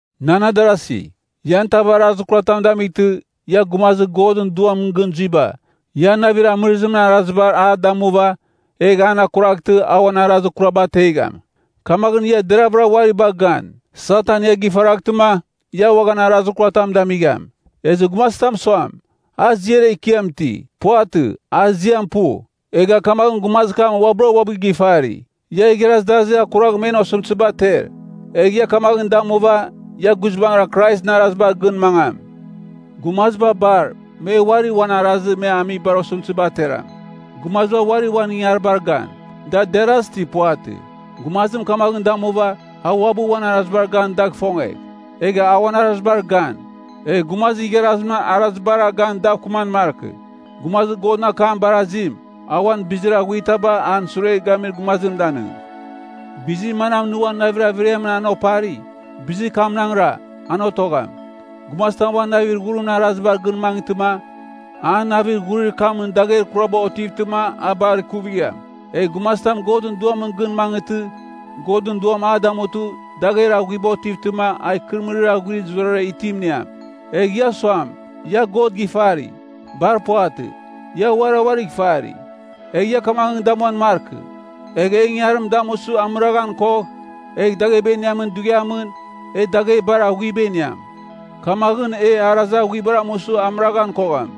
Nan adarasi, ian tav arazir kuratam damightɨ, ia gumazir Godɨn Duamɨn gɨn zuiba, ia navir amɨrɨzimɨn arazibar a damuva, egh an akuraghtɨ, a uan arazir kuraba ategham. Kamaghɨn ia deravɨra uari bagh gan, Satan ia gifaraghtɨma, ia uaghan arazir kuratam damigham. Ezɨ gumazitam suam, a ziar ekiam iti, puvatɨ, a ziam pu, egha kamaghɨn gumazir kam uabɨra uabɨ gifari. Ia igharaz darazir akuragh men osɨmtɨziba ater. Egh ia kamaghɨn damuva, ia guizbangɨra Kraisɨn arazibar gɨn mangam. Gumaziba bar, me uari uan arazir me amibar osɨmtɨziba ateram. Gumaziba uari uan ingangaribar gan, da deras ti puvatɨ. Gumazim kamaghɨn damuva, a uabɨ uan arazibar gan dagh ifongegh. Egh a uan arazibar gan, egh gumazir igharazimɨn arazibara gan dav kɨman markɨ. Gumazir Godɨn akam barazim, a uan bizir aghuitaba an sure gamir gumazim danɨng. Bizir manam nɨ uan navir averiamɨn an opari, bizir kamnaghra, an otogham. Gumazitam uan navir ghurimɨn arazibar gɨn mangɨtɨma, an navir ghurir kamɨn dagher kuraba otivtɨma a bar kuvigham. Egh gumazitam Godɨn Duamɨn gɨn mangɨtɨ, Godɨn Duam a damutɨ, dagher aghuiba otivtɨma, a ikɨrɨmɨrir aghuir zurara itim iniam. Egh ia suam, ia God gifari, bar puvatɨ. Ia uarira uarigh ifari, egh ia kamaghɨn damuan markɨ. Egh e ingangarim damusɨ amɨraghan kogh, egh dagheba iniamin dughiamɨn, e dagher bar aghuiba iniam. Kamaghɨn e arazir aghuibar amusɨ amɨraghan kogham.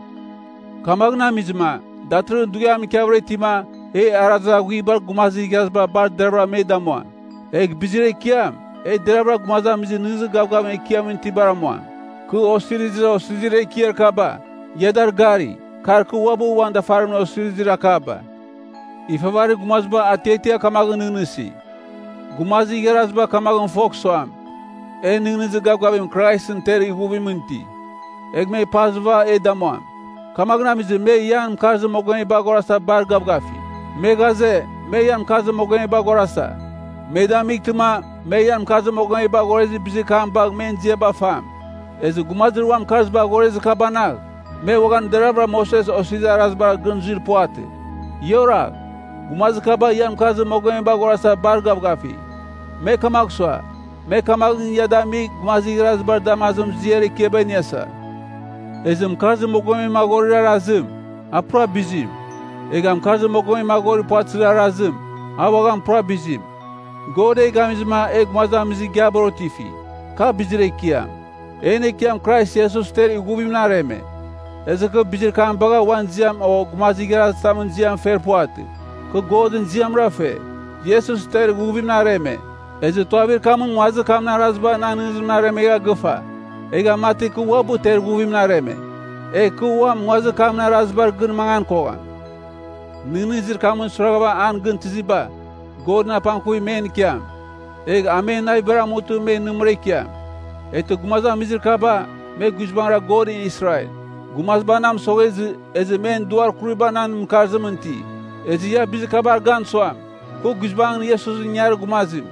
Kamaghɨn amizɨma, datɨrɨghɨn dughiam ikiavɨra itima, e arazir aghuibar gumazir igharaziba bar deravɨra me damuam. Egh bizir ekiam, e deravɨra gumazamizir nɨghnɨzir gavgavim Ekiamɨn itibar amuam. Kɨ osirizir osizirir ekiar kaba, ia dar gari, kar kɨ uabɨ uan dafarimɨn osirizir akaba. Ifavarir gumaziba atiatia kamaghɨn nɨghnɨsi, “Gumazir igharaziba kamaghɨn fogh suam, e nɨghnɨzir gavgavim Kraisɨn ter ighuvimɨn iti, egh me pazɨv e damuam.” Kamaghɨn amizɨma me ian mɨkarzir mogomeba aghorasa bar gavgafi. Me ghaze, me ian mɨkarzir mogomeba aghorasa, me damightɨma, me ian mɨkarzir mogomeba aghorezir bizir kam bagh men ziaba fam. Ezɨ gumazir uan mɨkarziba aghorezir kabanagh, me uaghan deravɨra Moses Osirizir Arazibar gɨn zuir puvatɨ. Ia oragh. Gumazir kaba ian mɨkarzir mogomeba aghorasa bar gavgafi. Me kamagh sua, me kamaghɨn ia damigh gumazir igharazibar damazimɨn ziar ekiaba iniasa. Ezɨ mɨkarzir mogomem aghorir arazim, a pura bizim. Egha mɨkarzir mogomem aghorir puvatɨzir arazim, a uaghan pura bizim. God e gamizɨma e gumazamizir igiabar otifi, ka bizir ekiam. En Ekiam Krais Iesus ter ighuvimɨn areme. Ezɨ kɨ bizir kam bagha uan ziam o gumazir igharazitamɨn ziam fer puvatɨ. Kɨ Godɨn ziamra fe. Iesus ter ighuvimɨn areme, ezɨ tuavir kamɨn nguazir kamɨn araziba nan nɨghnɨzimɨn aremegha gɨfa. Egha mati kɨ uabɨ ter ighuvimɨn areme. Egh kɨ uam nguazir kamɨn arazibar gɨn mangan kogham. Nɨghnɨzir kamɨn suiraghava an gɨn tɨziba, Godɨn apangkuvim men ikiam. Egh a men navibar amutɨma me nɨmɨra ikiam. Eghtɨ gumazamizir kaba, me guizbangɨra Godɨn Israel. Gumaziba na mɨsoghezɨ, ezɨ men duar kuriba nan mɨkarzimɨn iti. Ezɨ ia bizir kabar gan suam, kɨ guizbangɨn Iesusɨn ingangarir gumazim.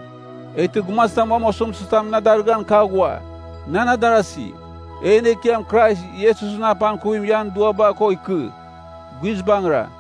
Eghtɨ gumazitam uam osɨmtɨzitam na darɨghan ka aghua. Nan adarasi, en Ekiam Krais Iesusɨn apangkuvim ian duaba ko ikɨ. Guizbangɨra.